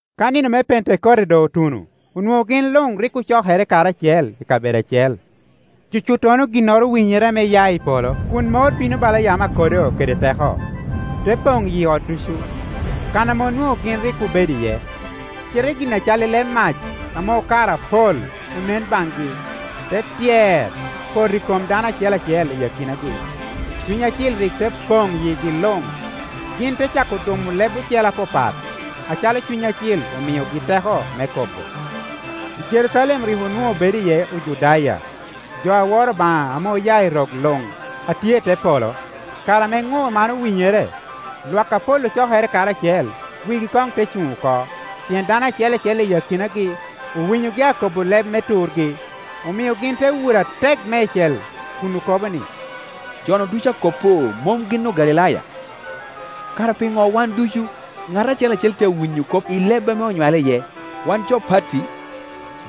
Ka nino me Pentekote doŋ otuno, onwoŋo gin luŋ rik ocokere karacel i kabedo acel. Cucuttono ginnoro owinyere ame ya i polo kun mor bino bala yamo akodo kede teko, te poŋ yi ot ducu, kan ame onwoŋo gin rik obedo iye. Cite gin a cal leb mac ame okaro apol onen baŋgi, te tyer, poto i kom dano acel acel i akinagi. Cuny Acil rik te poŋ yigi luŋ, gin te cako dumo leb ocele apapat, acalo Cuny Acil omiogi teko me kobo. I Jerucalem rik onwoŋo bedo iye Ojudaya, jo a woro Obaŋa ame oya i rok luŋ a tye i te polo. Kare ame ŋur man owinyere, lwak apol ocokere karacel, wigi koŋ te cuŋ oko, pien dano acel acel i akinagi owinyogi akobo leb me turgi. Omio gin te wuro atek meicel kun okobo ni, “Jonu ducu a kop-pu mom gin Ogalilaya? Kara piŋo wan ducu, ŋat acel acel tye awinyo kop i leb ame onywale iye? Wan jo Parti,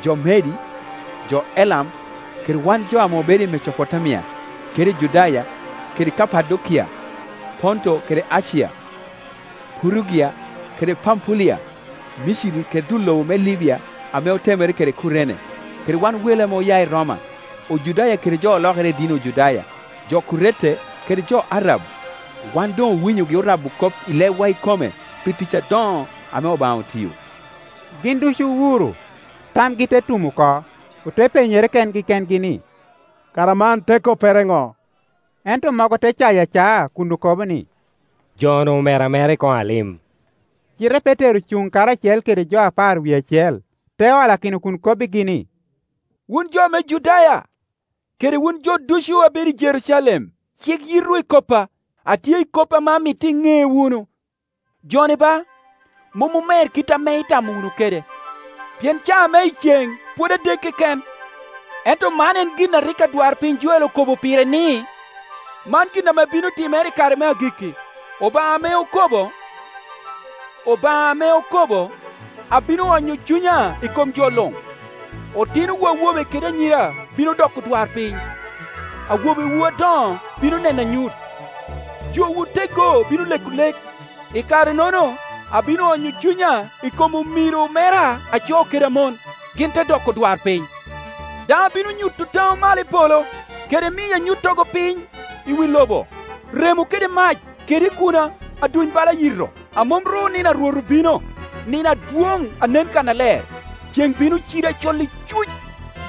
jo Medi, jo Elam, kede wan jo ame obedo i Mecopotamia kede i Judaya kede Kapadokia, Ponto kede Acia. Purugia kede Pampulia, Miciri kede dul lobo me Libia ame otemere kede Kurene, kede wan wele ame oya i Roma, Ojudaya kede jo olokere i dini Ojudaya, jo Kurete kede jo Arab, wan doŋ owinyogi orabo kop i lebwa ikome pi tic adoŋo ame Obaŋa otio.” Gin ducu owuro, tamgi te tum oko, ote penyere kengi kengi ni, “Kara man te koppere ŋo?” Ento mogo te cayo acaa kun okobo ni, “Jo-nu omer amera i koŋo alim.” Cite Petero ocuŋ karacel kede jo apar wie acel, te olakino kun kobbigi ni, “Wun jo me Judaya, kede wun jo ducu a bedo i Jerucalem, cik yitwu i koppa, atye i kop ame amito iŋe wunu. Jo-ni ba, mom omer kit ame itamo wunu kede, pien caa me iceŋ pwod adek keken; ento man en gin a rik adwarpiny Joel okobo pire ni, ‘Man gin ame bino timere i kare me agikki, Obaŋa ame okobo, abino onyo Cunya i kom jo luŋ, Otinowu awobe kede anyira bino doko odwarpiny, awobewu adoŋo bino neno anyut, jowu oteggo bino leko lek. I kare-nono abino onyo Cunya i kom omiro mera a co kede a mon, gin te doko odwarpiny. Daŋ abino nyuto taŋo malo i polo, kede miyo anyuttogo piny i wi lobo, remo kede mac kede ikuna a duny bala yito. A mom ru nino a Rwot obino, nino adwoŋ a nen kannaler, ceŋ bino cido acol icuc,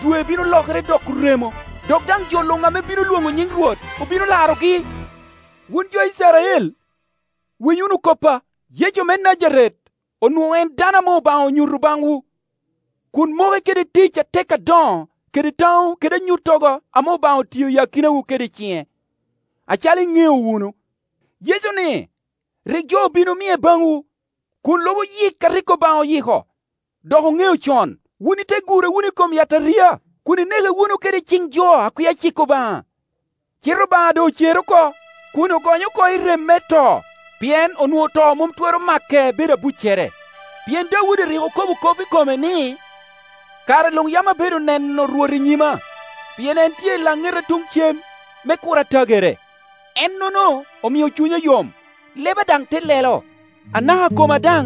dwe bino lokere doko remo. Dok daŋ jo luŋ ame bino lwoŋo nyiŋ Rwot obino larogi.’ “Wun jo Icrael winy wunu koppa: Yecu me Najaret onwoŋo en dano ame Obaŋa onyuto baŋwu kun moke kede tic atek adoŋo kede taŋo kede anyuttogo ame Obaŋa otio i akinawu kede ciŋe, acalo iŋeo wunu. Yecu-ni rik jo obin omie baŋwu, kun lubo yik a rik Obaŋa oyiko dok oŋeo con, wun ite gure wunu i kom yataria kun ineke wunu kede ciŋ jo a kwia cik Obaŋa. Cite Obaŋa doŋ ocere oko, kun ogonye oko i rem me to, pien onwoŋo to mom twero make bedo abuccere. Pien Daudi rik okobo kop i kome ni, ‘Kare luŋ yam abedo neno Rwot i nyima, pien en tye i laŋeta tun cem me kur atagere; Ennono omio cunya yom, leba daŋ te lelo; anaka koma daŋ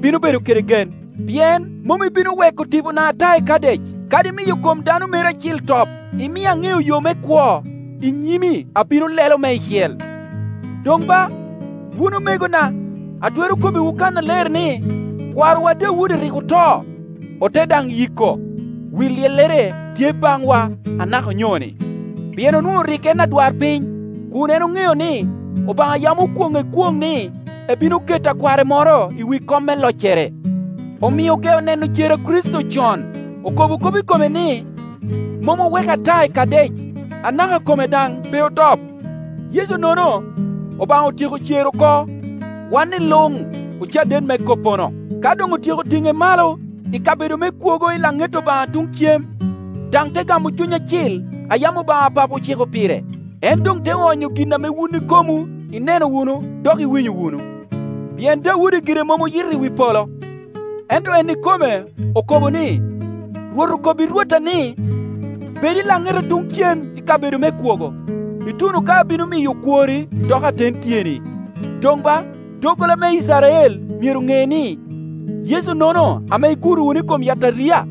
bino bedo kede gen. Pien mom ibino weko tipona ata i Kadec, kadi miyo kom Dano meri Acil top. Imia aŋeo yo me kwo; i nyimi abino lelo meicel.’ “Doŋ ba, wun omegona, atwero kobbiwu kannaler ni kwarowa Daudi rik oto, ote daŋ yiko, wi lyellere tye baŋwa anaka onyoni. Cam. 7.12-13Pien onwoŋo rik en adwarpiny; kun en oŋeo ni, Obaŋa yam okwonŋe kwoŋ ni ebino to akware moro i wi kom me loccere, omio ogeo neno cer a Kricito con, okobo kop i kome ni, mom oweke ata i Kadec, anaka kome daŋ pe otop. Yecu-nono Obaŋa otyeko cero oko wan-ni luŋ ocaden me koppono. Ka doŋ otyeko tuŋe malo i kabedo me kwogo i laŋet Obaŋa tuŋ cem, daŋ te gamo Cuny Acil a yam Obaŋa Papo ociko pire, en doŋ te onyo gin ame wun ikomwu ineno wunu dok iwinyo wunu. Pien Oaudi gire mom oyito i wi polo; ento en ikome okobo ni, ‘Rwot okobbi Rwotta ni, Bed i laŋeta tuŋ cem i kabedo me kwogo, ituno ka abino miyo okwori doko aten tyeni.’ Doŋ ba, doggola me Icrael myero ŋe ni, Yecu-nono ame iguro wunu i kom yataria,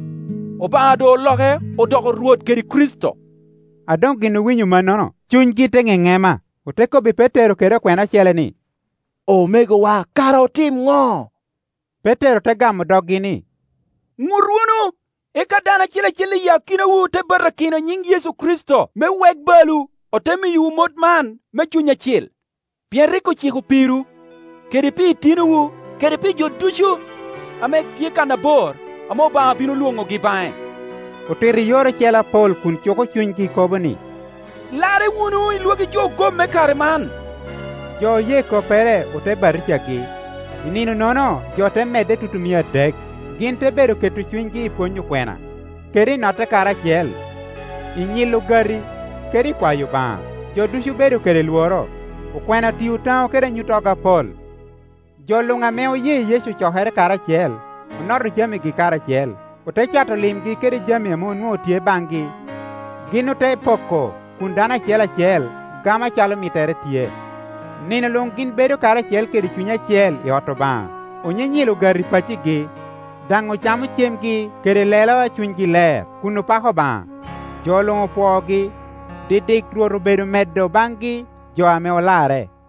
Obaŋa doŋ oloke odoko Rwot kede Kricito.” A doŋ gin owinyo mannono, cunygi te ŋeŋema, ote kobbi Petero kede okwena ocele ni, “Omegowa, kara otim ŋo?” Petero te gamo doggi ni, “Iŋut wunu, eka dano acel acel i akinawu te batakino i nyiŋ Yecu Kricito me wek balwu, ote miyowu mot man me Cuny Acil. Pien rik ociko pirwu, kede pi itinowu kede pi jo ducu ame tye kananbor ame Obaŋa bino lwoŋogi baŋe.” Otito i yore ocele apol, kun cuko cunygi kobo ni, “Larre wunu i lwagi jo ogom me kare man.” Jo oye koppere ote batijagi; i nino-nono jo te medde tutumia adek. Gin te bedo keto cunygi i pwony okwena, kede i notte karacel, i nyilo ogati, kede i kwayo Obaŋa. Jo ducu obedo kede lworo, okwena otio taŋo kede anyuttogo apol. Jo luŋ ame oye Yecu ocokere karacel, onoto jamigi karacel. Ote cato limgi kede jami ame owoŋo tye baŋgi, gin ote poko kun dano acel acel gamo acalo mittere tye. Nino luŋ gin bedo karacel kede cuny acel i ot Obaŋa, onyinyilo ogati i paccigi, daŋ ocamo cemgi kede lelo a cunygi ler, kun opako Obaŋa, jo luŋ pwoogi. Didik Rwot obedo medo baŋgi jo ame olarre.